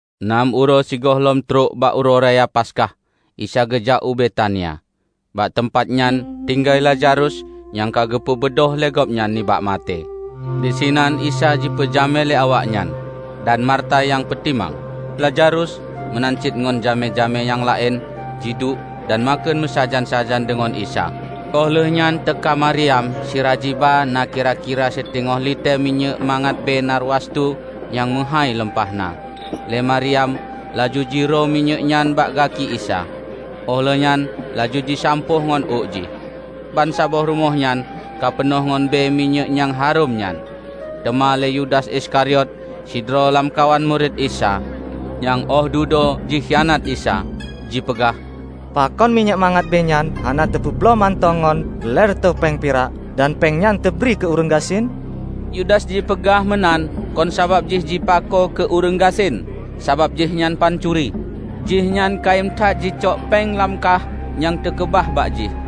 Nam uroe sigohlom trok bak Uroe Raya Paskah, Isa geujak u Betania. Bak teumpatnyan tinggai Lazarus nyang ka geupeubeudôh lé Gobnyan nibak maté. Disinan Isa jipeujamé lé awaknyan, dan Marta nyang peutimang. Lazarus meunan cit ngon jamé-jamé nyang laén jiduek dan makheun meusajan-sajan deungon Isa. Óh lheuehnyan teuka Maryam sira jiba na kira-kira siteungoh litée minyéuk mangat bée narwastu nyang meuhái lumpah na. Lé Maryam laju jiroe minyéuknyan bak gaki Isa, óh lheueh nyan laju jisampôh ngon ôk jih. Bansaboh rumoh nyan ka peunoh ngon bée minyéuk nyang harôm nyan. Teuma lé Yudas Iskariot, sidroe lamkawan murit Isa -- nyang óh dudoe jikhianat Isa -- jipeugah, "Pakon minyéuk mangat bée nyan hana teupeubloe mantong ngon lhée reutôh péng pirak, dan péng nyan teubri keu ureuëng gasien?" Yudas jipeugah meunan kon sabab jih jipako keu ureuëng gasien, sabab jihnyan pancuri. Jihnyan kayém that jicok péng lam kaih nyang teukeubah bak jih.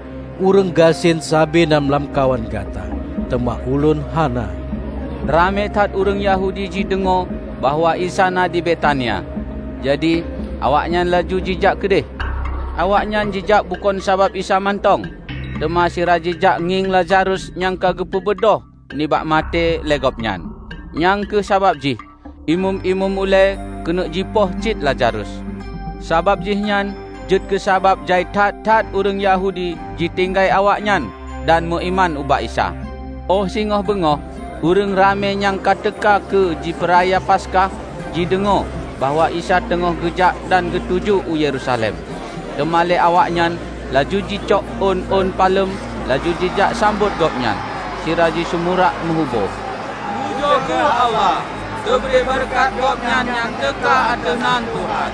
Ureuëng gasien sabe na lamkawan gata, teuma Ulôn hana." Ramé that ureuëng Yahudi jideungoe bahwa Isa na di Betania, jadi, awaknyan laju jijak keudeh. Awaknyan jijak bukon sabab Isa mantong, teuma sira jijak ngieng Lazarus nyang ka geupeubeudôh nibak maté lé Gobnyan. Nyang kheueh sabab jih Imeum-imeum ulée keuneuk jipoh cit Lazarus; sabab jihnyan jeuet keusabab jai that-that ureuëng Yahudi jitinggai awaknyan dan meuiman ubak Isa. Óh singoh beungoh ureuëng ramé nyang ka teuka keu jipeuraya Paskah jideungoe bahwa Isa teungoh geujak dan geutuju u Yerusalem. Teuma lé awaknyan laju jicok ôn-ôn palem laju jijak sambot Gobnyan, sira jisumurak meuhubo, "Pujoe kheueh Allah! Teubri beureukat Gobnyan nyang teuka ateueh nan Tuhan.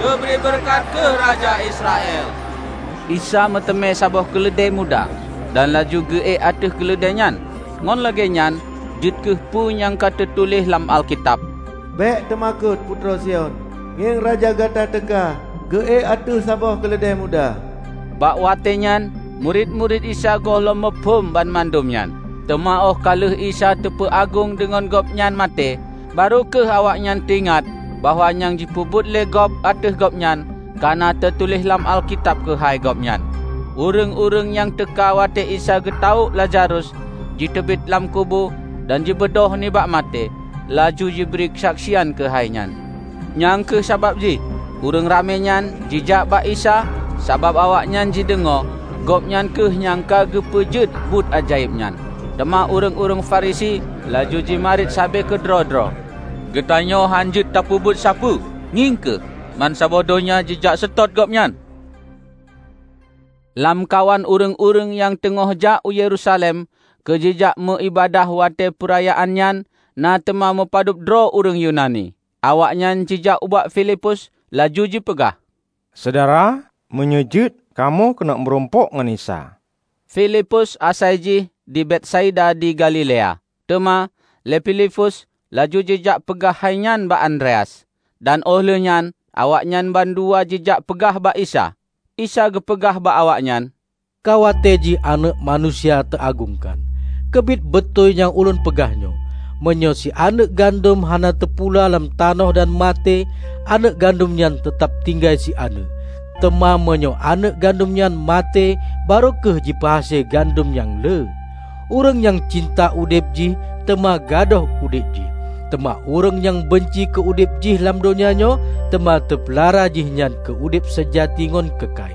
Teubri beureukat kheueh Raja Israel!" Isa meuteumé saboh keuleudée muda, dan laju geuék ateueh keuleudée nyan. Ngon lagée nyan jeuet kheueh peue nyang ka teutuléh lam Alkitab: "Bék teumakot, putroe Sion! Ngieng Raja gata teuka, geuék ateueh saboh keuleudée muda!" Bak watée nyan murit-murit Isa gohlom muphom banmandum nyan. Teuma óh ka lheueh Isa teupeuagong deungon Gobnyan maté, barô kheueh awaknyan teuingat bahwa nyang jipeubuet lé gob ateueh Gobnyan ka na teutuléh lam Alkitab keuhai Gobnyan. Ureuëng-ureuëng nyang teuka watée Isa geutawök Lazarus jiteubiet lam kubu dan jibeudôh nibak maté, laju jibri keusaksian keuhai nyan. Nyang kheueh sabab jih ureuëng ramé nyan jijak bak Isa sabab awaknyan jideungoe Gobnyan kheueh nyang ka geupeujeuet buet ajaéb nyan. Teuma ureuëng-ureuëng Farisi laju jimarit sabe keudroe-droe, "Geutanyoe hana jeuet tapeubuet sapeue! Ngieng kheueh, mansaboh donya jijak seutôt Gobnyan!" Lamkawan ureuëng-ureuëng nyang teungoh jak u Yerusalem keu jijak meuiébadat watée peurayaan nyan na teuma mupadub droe ureuëng Yunani. Awaknyan jijak ubak Filipus laju jipeugah, "Syedara, meunyoe jeuet, kamoe keuneuk meurumpok ngon Isa." (Filipus asai jih di Betsaida di Galilea.) Teuma lé Filipus laju jijak peugah hainyan bak Andreas, dan óh lheueh nyan awaknyan bandua jijak peugah bak Isa. Isa geupeugah bak awaknyan, "Ka watée jih Aneuëk Manusia teuagongkan. Keubiet beutôi nyang Ulôn peugah nyoe: meunyoe sianeuëk gandom hana teupula lam tanoh dan maté, aneuëk gandom nyan teutab tinggai sianeuëk. Teuma meunyoe aneuëk gandom nyan maté, barô kheueh jipeuhase gandom nyang le. Ureuëng nyang cinta udeb jih teuma gadôh udeb jih. Teuma ureuëng nyang banci keu udeb jih lam donya nyoe, teuma teupeulara jihnyan keu udeb seujati ngon keukai.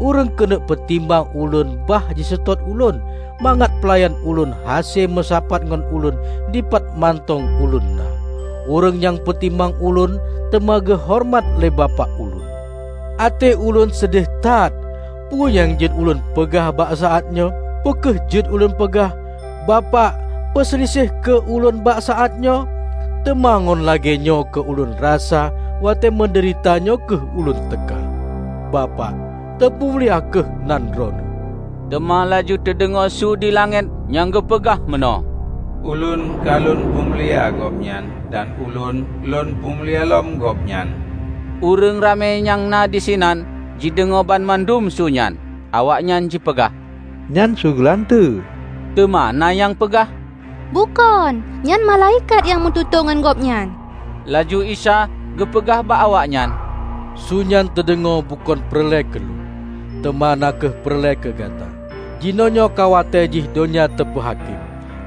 Ureuëng keuneuk peutimang Ulôn bah jiseutôt Ulôn; mangat peulayan Ulôn hase meusapat ngon Ulôn dipat mantong Ulôn na. Ureuëng nyang peutimang Ulôn teuma geuhoreumat lé Bapak Lôn." "Até Ulôn seudeh that; peue nyang jeuet Lôn peugah bak saát nyoe? Peu kheueh jeuet Lôn peugah, 'Bapak, peuseuliseh kheueh Ulôn bak saátnyoe'? Teuma ngon lagée nyoe keu Lôn rasa watée meudeurita nyoe kheueh Ulôn teuka. Bapak, teupeumulia kheueh nan Droeneueh!" Teuma laju teudeungoe su di langét nyang geupeugah meunoe, "Ulôn ka Lôn peumulia Gobnyan, dan Ulôn Lôn peumulia lom Gobnyan." Ureuëng ramé nyang na disinan jideungoe banmandum su nyan. Awaknyan jipeugah, "Nyan su geulanteue!" Teuma na nyang peugah, "Bukon, nyan Malaikat nyang meututoe ngon Gobnyan!" Laju Isa geupeugah bak awaknyan, "Su nyan teudeungoe, bukon peureulée keu Lôn, teuma na kheueh peureulée keu gata. Jinoenyoe ka watée jih donya teupeuhakém;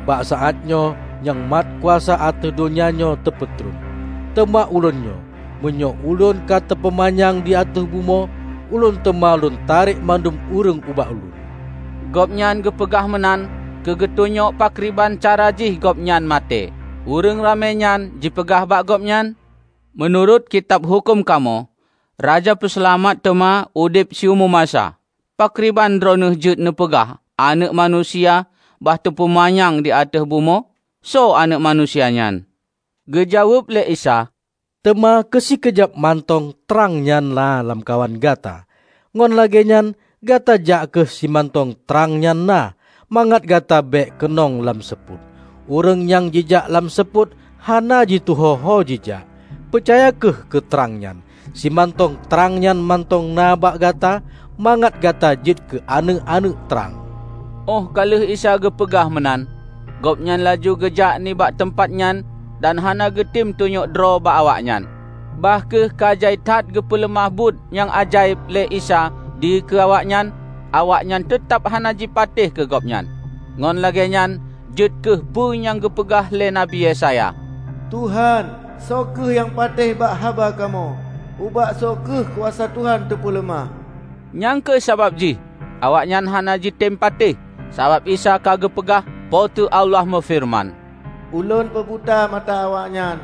bak saát nyoe nyang mat kuasa ateueh donya nyoe teupeutron. Teuma Ulôn nyoe, meunyoe Ulôn ka teupeumanyang di ateueh bumoe, Ulôn teuma Lôn tarek mandum ureuëng ubak Ulôn." Gobnyan geupeugah meunan keu geutunyok pakriban cara jih Gobnyan maté. Ureuëng ramé nyan jipeugah bak Gobnyan, "Meunurot Kitab Huköm kamoe, Raja Peuseulamat teuma udeb siumu masa. Pakriban droeneueh jeuet neupeugah Aneuëk Manusia bah teupeumanyang di ateueh bumoe? Soe Aneuëk Manusia nyan?" Geujaweueb lé Isa, "Teuma keu sikeujab mantong trang nyan na lamkawan gata. Ngon lagée nyan, gata jak kheueh simantong trang nyan na, mangat gata bék keunong lam seupôt. Ureuëng nyang jijak lam seupôt hana jituho hojijak. Peucaya kheueh keu trang nyan, simantong trang nyan mantong na bak gata, mangat gata jeuet keu aneuëk-aneuëk trang." Óh ka lheueh Isa geupeugah meunan, Gobnyan laju geujak nibak teumpatnyan dan hana geutem tunyok droe bak awaknyan. Bah kheueh ka jai that geupeuleumah buet nyang ajaéb lé Isa dikeue awaknyan, awaknyan teutab hana jipatéh keu gobnyan. Ngon lagée nyan jeuet kheueh peue nyang geupeugah lé Nabi Yesaya, "Tuhan, soe kheueh nyang patéh bak haba kamoe? Ubak soe kheueh kuasa Tuhan teupeuleumah?" Nyang kheueh sabab jih awaknyan hana jitem patéh, sabab Isa ka geupeugah, "Po teu Allah meufeureuman, 'Ulôn peubuta mata awaknyan,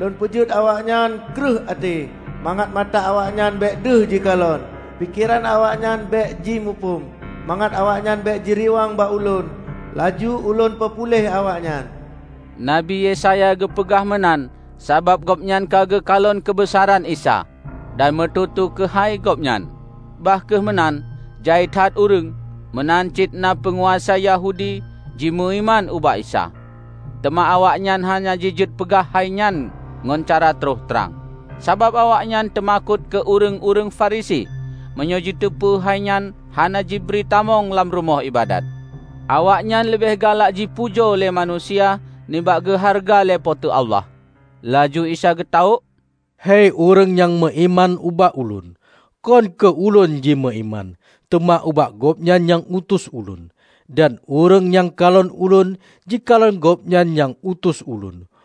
Lôn peujeuet awaknyan kreueh até; mangat mata awaknyan bék deuh jikalon, pikeran awaknyan bék jimuphom. Mangat awaknyan bék jiriwang bak Ulôn, laju Ulôn peupuléh awaknyan.' " Nabi Yesaya geupeugah meunan sabab gobnyan ka geukalon keubeusaran Isa, dan meututoe keuhai Gobnyan. Bah kheueh meunan, jai that ureuëng, meunan cit na peunguasa Yahudi jimeuiman ubak Isa. Teuma awaknyan hana jijeuet peugah hainyan ngon cara troh trang, sabab awaknyan teumakot keu ureuëng-ureuëng Farisi meunyoe jiteupeu hainyan hana jibri tamong lam rumoh iébadat. Awaknyan leubeh galak jipujoe lé manusia nibak geuhareuga lé Po teu Allah. Laju Isa geutawök, "Hei ureuëng nyang meuiman ubak Ulôn, kon keu Ulôn jimeuiman, teuma ubak Gobnyan nyang utus Ulôn. Dan ureuëng nyang kalon Ulôn, jikalon Gobnyan nyang utus Ulôn.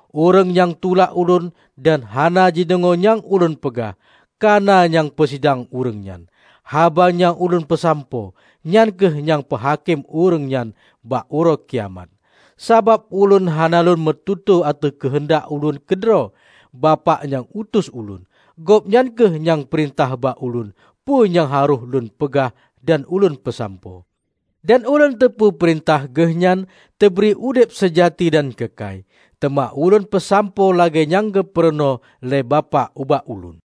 Ureuëng nyang tulak Ulôn dan hana jideungoe nyang Ulôn peugah, ka na nyang peusidang ureuëng nyan. Haba nyang Ulôn peusampoe, nyan kheueh nyang peuhakém ureuëng nyan bak Uroe Kiamat. Sabab Ulôn hana Lôn meututoe ateueh keuheundak Ulôn keudroe; Bapak nyang utus Ulôn, Gobnyan kheueh nyang peurintah bak Ulôn peue nyang harôh Lôn peugah dan Ulôn peusampoe. Dan Ulôn teupeue peurintah Geuh nyan teubri udeb seujati dan keukai. Teuma Ulôn peusampoe lagée nyang geupeurunoe lé Bapak ubak Ulôn."